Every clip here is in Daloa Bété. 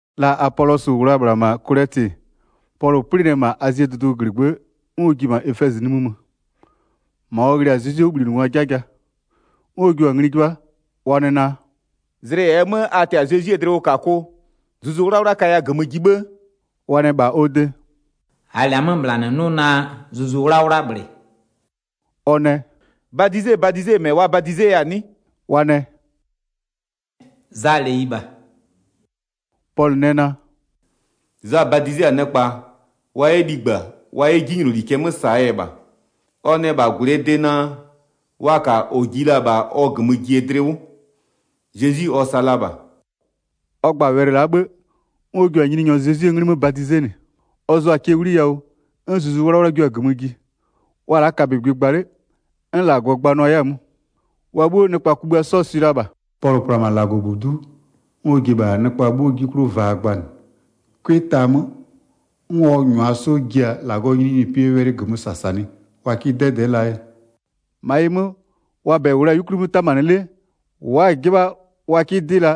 La Apolɔsɩ -wʋ la-a -bhla -ma Kolɛtɩ, Pɔlʋ 'plɩnɩ-ɛ -ma Azie dʋdʋɔ -glɩgbë'ë, 'n ɔ ji-e -ma Efɛzɩ nimï mö. -Ma ɔ ghlɩ-a Zezwie 'wʋbhlinɩngwaa 'jaja. 'N ɔ jua-a ngli 'jɩbha, ɔ nɛ naa: “Zlɩ -ɛɛ 'mö a tɛ-a Zezwie dlɩwʋkakʋ, Zuzu 'Wlawla kaya -gömö ji 'bhë?” Wa nɛ -bha ɔ de: “-Aa -lɛ-a 'mö -bhla -nɩ 'nʋ naa Zuzu 'Wlawla -bhlɩ.” Ɔ nɛ: “Badizebadizee -mɛ wa badizeya-a 'nɩ?” Wa nɛ: “Zaa -leyi -bha.” Pɔlʋ nɛ naa: “Za badize-a nɩkpa, wa 'yɛ ligba wa 'yɛ 'jinyloli cɛ 'mö -saa yɛ -bha. Ɔ nɛ -bha -gwlɩɛ de naa wa -ka -ɔ ji la-a -bha ɔ -gömö jie dlɩ 'wʋ. Zezwi ɔ sa la -bha.” Ɔ gba-a wɛlɩ la'a 'bhë, 'n ɔ jua-a Nyininyɔ Zezwie 'nglɩ 'mö badizenɩ. Ɔ zʋʋa-a cɛ 'wliyawʋ, 'n Zuzu 'Wlawla jua-a -gömö ji. Wa-a la'a kabögbɩ gba 'le, 'n -Lagɔ gbanʋa 'yɛ-a 'mö. Wa 'bhuo, nɩkpa kugbïa 'sɔɔ swɩ la -bha. Pɔlʋ pla-a -ma -Lagɔbudu'u, 'n ɔ ji-e -bha nɩkpa 'bhuo 'ji 'klʋ vaa gbanɩ. 'Cʋɩ ta 'mö, 'n ɔ -nyʋa 'sɔ ji-a -Lagɔɔ nyininyinipɩɛ wɛlɩ -gömö -sasanɩ wa 'kɩ 'dɛdɛ'ɛ laa yɛ. 9-Ma ɩ 'mö, wa -bɛ -wʋ la-a 'yukwli 'mö 'tamanɩ 'le, wa'a-a 'jɩbha wa 'kɩ 'dɩ la,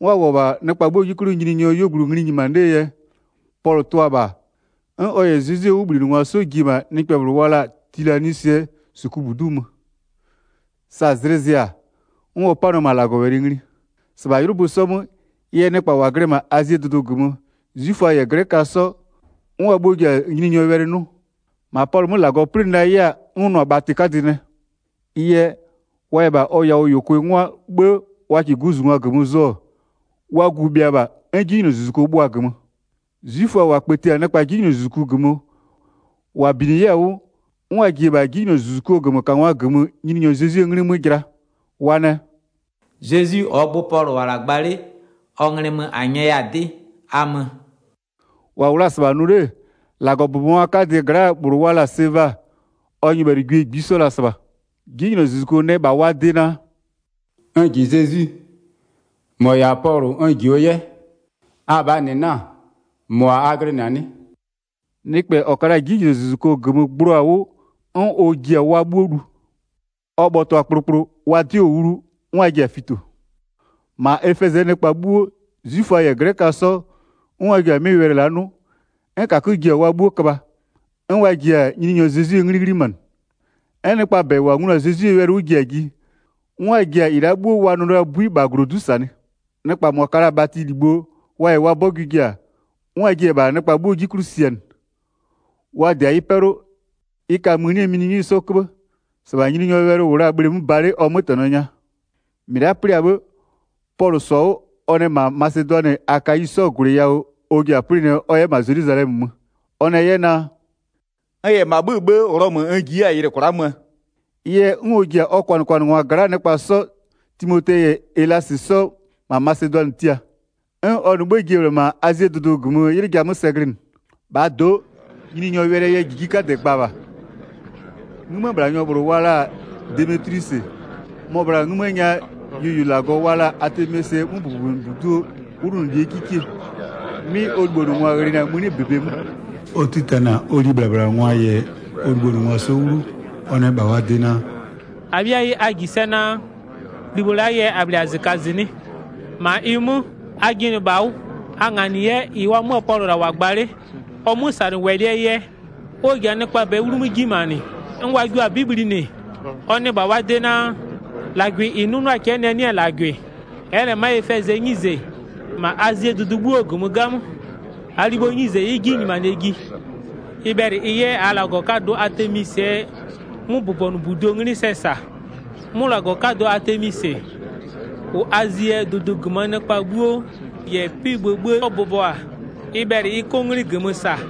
'n wa -wʋɔ-ɔ -bha nɩkpa 'bhuoo 'ji 'klʋ Nyininyɔɔ 'yuogblʋ ngli nyimanɩ 'lee yɛ, Pɔlʋ tʋa-a -bha, 'n ɔ -yɛ Zezwie 'wʋbhlinɩngwa 'sɔ ji-e -ma nɩkpɛ -bhlʋ wa la-a Tilanwisɩɛ -sukubudu'u mö. Sa zlɩ zɩ-a, 'n ɔ 'panʋa-a -ma -Lagɔwɛlɩ ngli. 10-Sɩbha 'ylʋbö 'sɔ 'mö, ɩ yɛ nɩkpa -wa glɩ-ɛ -ma Azie dʋdʋ -gömö, 'zwiföa -yɛ 'glɛköa 'sɔ, 'n wa 'bhuo ji-a Nyininyɔɔ wɛlɩ 'nʋ. Sevaa 'gwie nɛ wa 'yɛ 'jinylozuzuku kpëti 11-Ma Pɔlʋ 'mö -Lagɔ 'plɩnɩ la 'yɛ-a 'n ʋ nʋ-a bhatɩ 'kadɩ nɛ. Ɩ yɛ, wa -yɛ -bha ɔ yawʋ -yʋkʋɩ 'ngwa 'bhë wa -kɩɩ guzungwa -gömö zʋ-ɔ, wa gu-u bhɩa -bha, 'n 'jinylozuzuku bhʋa-a -gömö. 'Zwiföa -wa kpëti-a nɩkpa 'jinylozuzuku -gömö, -wa binɩ-a ɩ yɛ 'wʋ, 'n wa ji-e -bha 'jinylozuzukuo -gömökangwa -gömö Nyininyɔ Zezwie 'nglɩ 'mö jɩla, wa nɛ: “Zezwi -ɔɔ gbʋ Pɔlʋ -wʋ-ɔ -la gba 'le, ɔ nglɩ mö -a nyɛya-a 'dɩ, a mö.” 14-Wa -wʋ la-a -sɩbha nʋ 'le, -Lagɔbʋbɔngwa 'kadɩɛ gla'aa -bhlʋ wa la-a Seva, ɔ nyɩbhɛlɩgwie -ngbisɔ la-a -sɩbha. 'Jinylozuzuko nɛ -bha wa de naa: “N -ji Zezwi, -mɔ -yɛ-a Pɔlʋ n jio 'yɛ. Abhaa -nɩ 'na-a, -mʋa a glɩnɩ-a 'nɩ?” Nɩkpɛ -ɔ ka la-a 'jinylozuzuko -gömö gblua-a 'wʋ, 'n ɔ ji-a wa 'bhuo lu. Ɔ bhɔtʋa-a kplokplo, wa 'dɩɔ-ɔ 'wlu, 'n wa ji-a fito. 17-Ma Efɛzɩɛ nɩkpa 'bhuo, 'zwiföa -yɛ 'glɛköa 'sɔ, 'n wa ji-a 'mɩ wɛlɩ la'a 'nʋ, 'n -kakö ji-a wa 'bhuo köbha, 'n wa ji-a Nyininyɔ Zezwie 'nglɩ 'ghlimanɩ. 'N nɩkpa -bɛ -wa nglu-a Zezwie wɛlɩ 'wʋ ji-a ji, 'n wa ji-a -ɩ la'a 'bhuo wa nʋ la-aa 'bui -bha -glodu'u -sanɩ. Nɩkpaa -mʋa ka la-a bhatɩlibho, wa -yɛ wa 'bɔgʋɩ ji-a, 'n wa jiɩ-e -bha nɩkpa 'bhuoo 'ji 'klʋ sianɩ. Wa -dɩ-a ɩ 'pɛlʋ, ɩ ka mënie mininywɩ 'sɔ 'köbhë. 20-Sɩbha Nyininyɔɔ wɛlɩ -wʋ la-a bhleemö ba 'le ɔ 'mötɛnɔ nya. 21-Mɩ la'a 'plɩ-a 'bhë, Pɔlʋ -sɔ-a 'wʋ, ɔ nɛ -ma Masedʋanɩ -yɛ Akayi 'sɔɔ -gwlɩ yawʋ ɔ ji-a 'plɩnɩɛ ɔ 'yɛ -ma Zelwizalɛmö mö. Ɔ nɛ 'yɛ naa: “N -yɛ -ma 'bhö-ö 'bhë Ghlɔmö n ji 'yɛ-a yɩlɩ kwla'a möö.” Ɩ yɛ, 'n ɔ ji-a ɔ kwanɩkwanɩngwa gla'aa nɩkpa 'sɔ, Timote -yɛ Elasɩ 'sɔ -ma Masedʋanɩ tia. 'N ɔ -nɩ 'bhë ji-e -bhla -ma Azie dʋdʋ -gömö 'ylɩ ja 'mö sɛ glɩnɩ. Demetlwisɩ yɛ 'gbë ghayɩ 'pa 23-Bhaa do'o, Nyininyɔɔ wɛlɩɛ yɛ -jiji 'kadɛ gba -bha. 'Ngïmëbhlanyɔ -bhlʋ wa la-a Demetlwisɩ, mɔ-ɔ bhla-a 'ngïmë nya yuoyuolagɔ wa la-a Atemisɩɛ 'möbʋbɔnʋbuduo 'wlʋnʋlie 'kikie, 'mɩ ɔ libhonʋngwa ghlɩnɩa-a mëni -bebe 'mö. Ɔ 'titanɩ-a ɔ libhlabhlangwa -yɛ ɔ libhonʋngwa 'sɔ 'wlu, ɔ nɛ -bha wa de naa: “-Abhɩayi a -ji sɛ naa, libho la'aa yɛ -a -bhlɩ-a -zɩkazɩnɩ'ɩ. 26-Ma ɩ 'mö, a jɩnɩ -bha 'wʋ, a nganɩ 'yɛ -ɩ wamöö Pɔlʋ -la -wʋ-a gba 'le, ɔ 'mösanɩwɛlɩɛ yɛ, 'n ɔ ji-a nɩkpaa -bɛɛ 'wlumö 'ji nyimanɩ, 'n wa jio-a 'bɩ bhlinɩ. Ɔ nɛ -bha wa de naa: -Lagwɩ -ɩ 'nʋnʋɔ-a cɛ'ɛ nɛ 'nɩ-ɛ -lagwɩ. Ɛ'ɛ -lɛ ma'a Efɛzɩɛ 'nyize, -ma Azie dʋdʋ 'bhuoo -gömö 'gamö. 27-Aa libho 'nyize ɩ'ɩ -lɛ 'ji nyimanɩɛ ji. Ɩ bhɛlɩ ɩ 'yɛ -aa -lagɔ 'kadʋ Atemisɩɛ 'möbʋbɔnʋbuduo 'nglɩ sɛ -sa. 'Mʋ -lagɔ 'kadʋ Atemisɩ -ʋ Azie dʋdʋ -gömöö nɩkpa 'bhuo -yɛ 'pɩ-ɩ bhë 'sɔ bʋbɔ-a, ɩ bhɛlɩ ɩ 'kʋ 'nglɩ -gömö -sa.”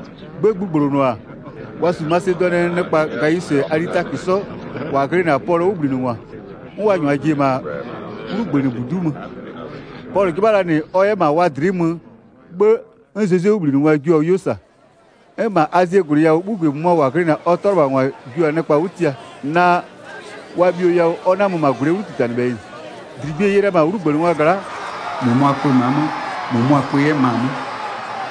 'Gbë gbugblonʋ-a, wa -su Masedʋanɩɛ nɩkpa Gawisɩ -yɛ Alitakö sɔ -wa glɩnɩ-a Pɔlʋɔ 'wʋbhlinɩngwa, 'n wa -nyʋa ji-e -ma 'wlugbënɩbudu'u mö. Pɔlʋ 'jɩbha la -nɩ ɔ 'yɛ -ma wa dlɩ'ɩ mö 'bhë, 'n Zezwie 'wʋbhlinɩngwa jio-a 'yuo -sa. 'N -ma Azie -gwlɩ yawʋɔ 'bhugwie -mʋmʋa -wa glɩnɩ-a ɔ 'tʋalɩbhangwa jio-a nɩkpa 'wʋ tia naa, wa bhio yawʋ ɔ 'na-a mö -ma -gwlɩɛ 'wlutitanɩbhɛyɩ -nɩ. 32-Dligbie-e ye la-a -ma 'wlugbënɩngwa gla'a. -Mʋmʋa kpö ma'a 'mö, -mʋmʋa kpö 'yɛ ma 'mö.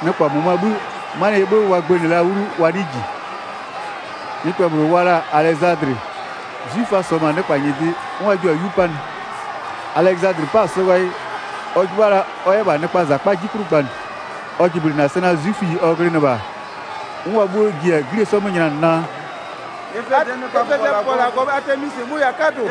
Nɩkpa -mʋmʋaa 'bhï, 'manɩɛ yɛ wa gbënɩ la 'wlu wa 'nɩɩ -ji. Nɩkpɛ -bhlʋ wa la-a Alɛzadlɩ, 'zwiföa -sɔ-ɔ -ma nɩkpa -nyɩdɩ, 'n wa jio-a 'yu 'panɩ. Alɛzadlɩ 'pa-a sɔ ghayɩ, ɔ 'jɩbha la ɔ 'yɛ -bha nɩkpaa -zakpa 'ji 'klʋ gbanɩ. Wa jɩblɩnɩ-a sɛ naa 'zwiföyi ɔ glɩnɩ -bha-a, 'n wa 'bhuo ji-a 'glie 'sɔɔ 'mö nylanɩ naa: “Efɛzɩɛ nɩkpaa bʋbɔlagɔ Atemisɩ, mʋ-ʋ -yɛ-a 'kadʋ.”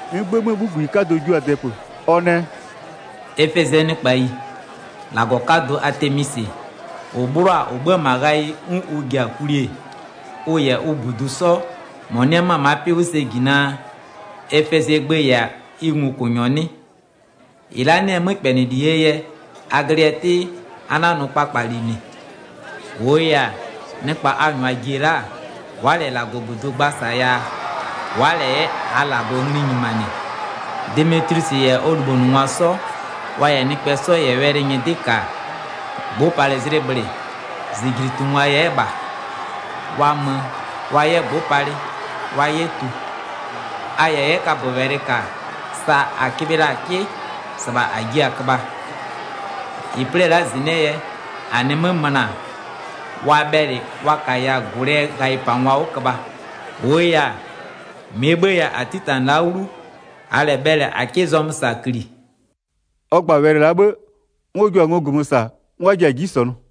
'N 'gbë 'möö 'bhuguyi 'kadɔ jua-a dɛpö, ɔ nɛ: “Efɛzɩɛ nɩkpayi, -lagɔ 'kadʋ Atemisɩ, -ʋ 'bhlɔ-a -ʋ 'bhö-ö -ma ghayɩ 'n ʋ ji-a kwli-e, ʋ -yɛ ʋ -budu 'sɔ -mɔ 'nɩ-ɛ ma'a 'pɩ 'wʋ sɛ -ji naa, Efɛzɩɛ gbë -yɛ-a ɩ ngokʋnyɔ 'nɩ? 36-Ɩ la'a 'nɩ-ɛ 'mökpɛnɩlie yɛ, a glɩ yɛ 'tɩ, a 'na-a nʋ kpakpali -nɩ. 37-Wʋʋ yɛ-a, nɩkpa a -nyʋa ji-e la'a, wa'a -lɛ -lagɔbudu gba -sa yaa, wa'a -lɛ 'yɛ -aa -lagɔ ngli nyimanɩ. Demetlwisɩ -yɛ ɔ libhonʋngwa 'sɔ, wa -yɛ nɩkpɛ 'sɔ -yɛ wɛlɩ nyɩdɩ'ɩ -ka-a, gbʋʋpalɩzlɩ -bhlɩ, -zijlitungwa-a 'yɛ -bha. Wa mö, wa 'yɛ gbʋ'ʋ palɩ, wa 'yɛ tu. A -yɛ 'yɛ kaböwɛlɩ -ka-a, sa -a köbhɩ la-a 'kɩ, -sɩbha -a jiɩ-a köbha. 40-Ɩ 'plɩ-ɛ la'a -zɩnɩ'ɩɛ yɛ, -a nɩ 'mö möna, wa bhɛlɩ wa -kaya -gwlɩɛ ghayɩpangwa 'wʋ köbha. -Wʋʋ yɛ-a, -mɩɛ 'bhëë yɛ -a 'titanɩ-ɛ la'a 'wlu, -aa -lɛ bhɛlɩ -a 'kɩ zɔmö -sa -kli.” Ɔ gba-a wɛlɩ la'a 'bhë, 'n ɔ jua-a ngo -gömö -sa 'n wa ji-a 'ji -sɔnʋ.